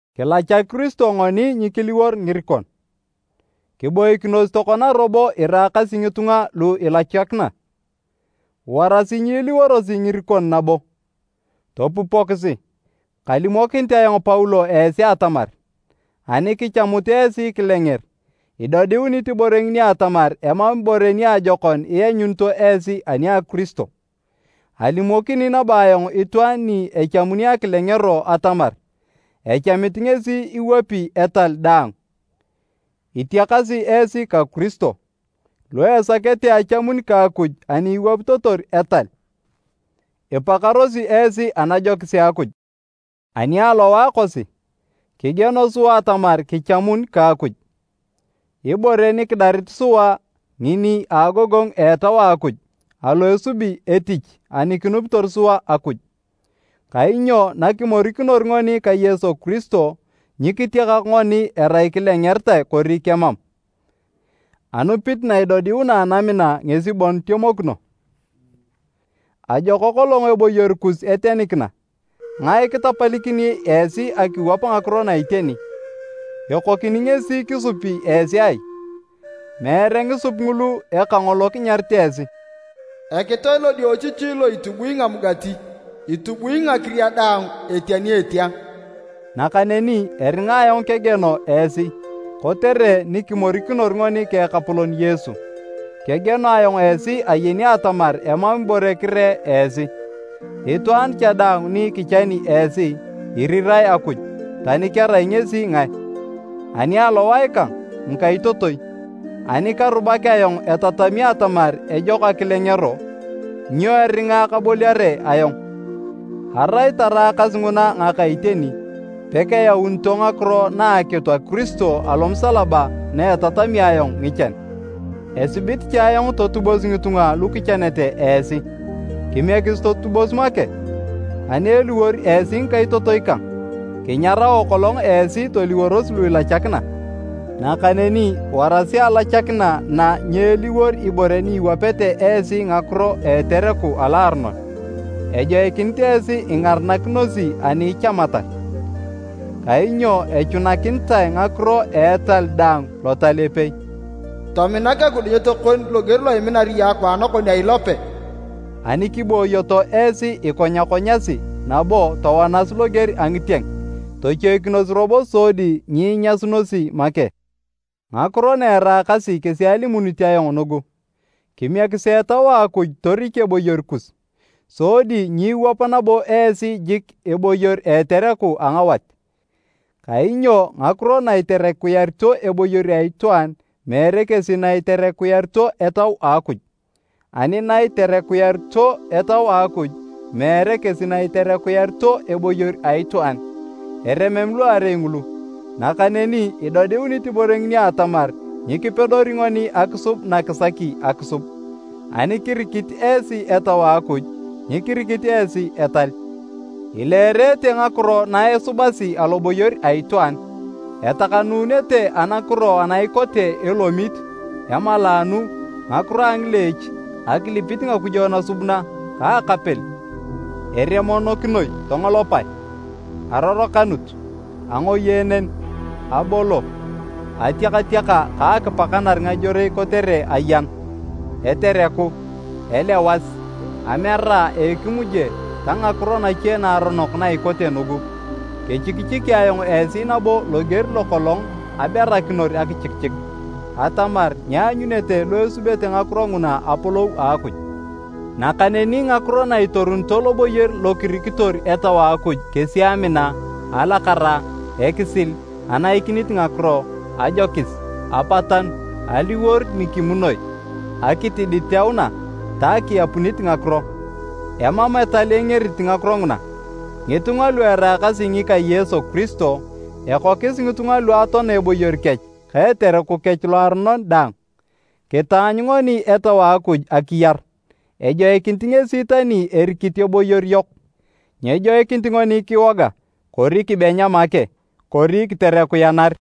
Kilachak Kiristo ngoni nyikiliwor ngirikon! Kiboikinos tokona robo iraakasi ngitunga lu ilachakina, warasi nyiliworosi ngirikon nabo. Topupokisi! Kalimokinit ayong Paulo esi atamar, ani kichamut esi kilenger, idodiunit ibore ngini atamar emam ibore niajokon ianyunito esi ani a Kiristo. Alimokini nabo ayong itwaan ni echamuni akilengero atamar echamit ngesi iwapi etal daang. Itiakasi esi ka Kiristo, lu isakete achamun ka Akuj ani iwapitotor etal. Ipakarosi esi anajokis a Akuj. Ani alowae kosi, kigieno sua atamar kichamun ka Akuj. Ibore nikidarit sua ngini a agogongu a Etau a Akuj alo esubi etich ani kinupitor sua Akuj. Kainyo nakimorikinor ngoni ka Yesu Kiristo, nyikitiakak ngoni erai kilengeritae kori kemam, anupit na idodiuna anamina ngesi bon itemokino. Ajok kolong eboyor kus etenikina! Ngae kitapalikini esi akiwap ngakiro na iteni? Ekokini ngesi kisupi esi ai? Meere ngisup ngulu eka ngolo kinyarit esi. “Ekitoe lodiochichi lo itubui ngamugati, itubui ngakiria daang etia ni etia.” Nakaneni eringa ayong kegieno esi. Kotere nikimorikinor ngoni ka Ekapolon Yesu, kegieno ayong esi ayeni atamar emam ibore kiree esi. Itwaan cha daang ni kichani esi, irirae Akuj, tani kerai ngesi ngae. Ani alowae kang, ngikaitotoi, ani karubak ayong etatami atamar ejok akilengero, nyo eringa kaboliare ayong? Arai taraakas nguna ngaka iteni, pekeyaunito ngakiro na akitu a Kiristo alomusalaba na etatami ayong ngichan. Esibit cha ayong totubos ngitunga lu kichanete esi, kimiekisi totubos make! Ani eliwor esi ngikaitotoi kang, kinyarao kolong esi toliworos lu ilachakina. Nakaneni warasi alachakina na nyeeliwor ibore ni iwapeta esi ngakiro a etereku aloaronon. Ejoikinit esi ingaranakinosi ani ichamatar. Kainyo echunakinitae ngakiro a etal daang Lotal epei, “Tominak ekidunyet kon loger lo iminar iyong akwaan kon a ilope.” Ani kiboyoto esi ikonyakonyasi nabo towanas loger a ngitieng, tochoikinos robo sodi nyiinyasunosi make. Ngakiro na eraakasi kesi alimunit ayong nugu, kimiekisi Etau a Akuj torik eboyor kus, sodi nyiiwap nabo esi jik eboyor a etereku a ngawat. Kainyo ngakiro na iterekuyarito eboyor a itwaan meere kesi na iterekuyarito Etau a Akuj, ani na iterekuyarito Etau a Akuj, meere kesi na iterekuyarito eboyor a itwaan. Eremem luarei ngulu, nakaneni idodiunit ibore ngini atamar nyikipedori ngoni akisub na kisaki akisub. Ani kirikit esi Etau a Akuj, nyikirikit esi etal. Ileerete ngakiro na esubasi aloboyor a itwaan. Etakanuunete anakiro ana ikote elomit, emalaanu, ngakiro a ngileech, akilipit ngakujo nasubuna ka akapel. Eremonokinoi tongolopae, arorokanut, angoyeenen, abolo, atiakatiaka ka akipakanar ngajorei kotere ayan, etereku, elewas, amera a ekimuje ta ngakiro nache naaronok na ikote nugu. Kechikichiki ayong esi nabo loger lokolong aberakinor akichikichik, atamar nyeanyunete lu esubete ngakiro nguna apolou a Akuj. Nakaneni ngakiro na itorunito loboyor lo kirikitor Etau a Akuj kesi amina, alakara, ekisil, anaikinit ngakiro, ajokis, apatanu, aliwor nikimunoi, akitiditeuna ta akiapunit ngakiro. Emam etal engerit ngakiro nguna. Ngitunga lu eraakasi ngika Yesu Kiristo, ekokis ngitunga lu atoana eboyor kech ka etereku kech loaronon daang. Kitaanyu ngoni Etau a Akuj akiyar, ejoikinit ngesi tani erikit eboyor yok. Nyejoikinit ngoni kiwoga, kori kibenya make kori kiterekuyanar.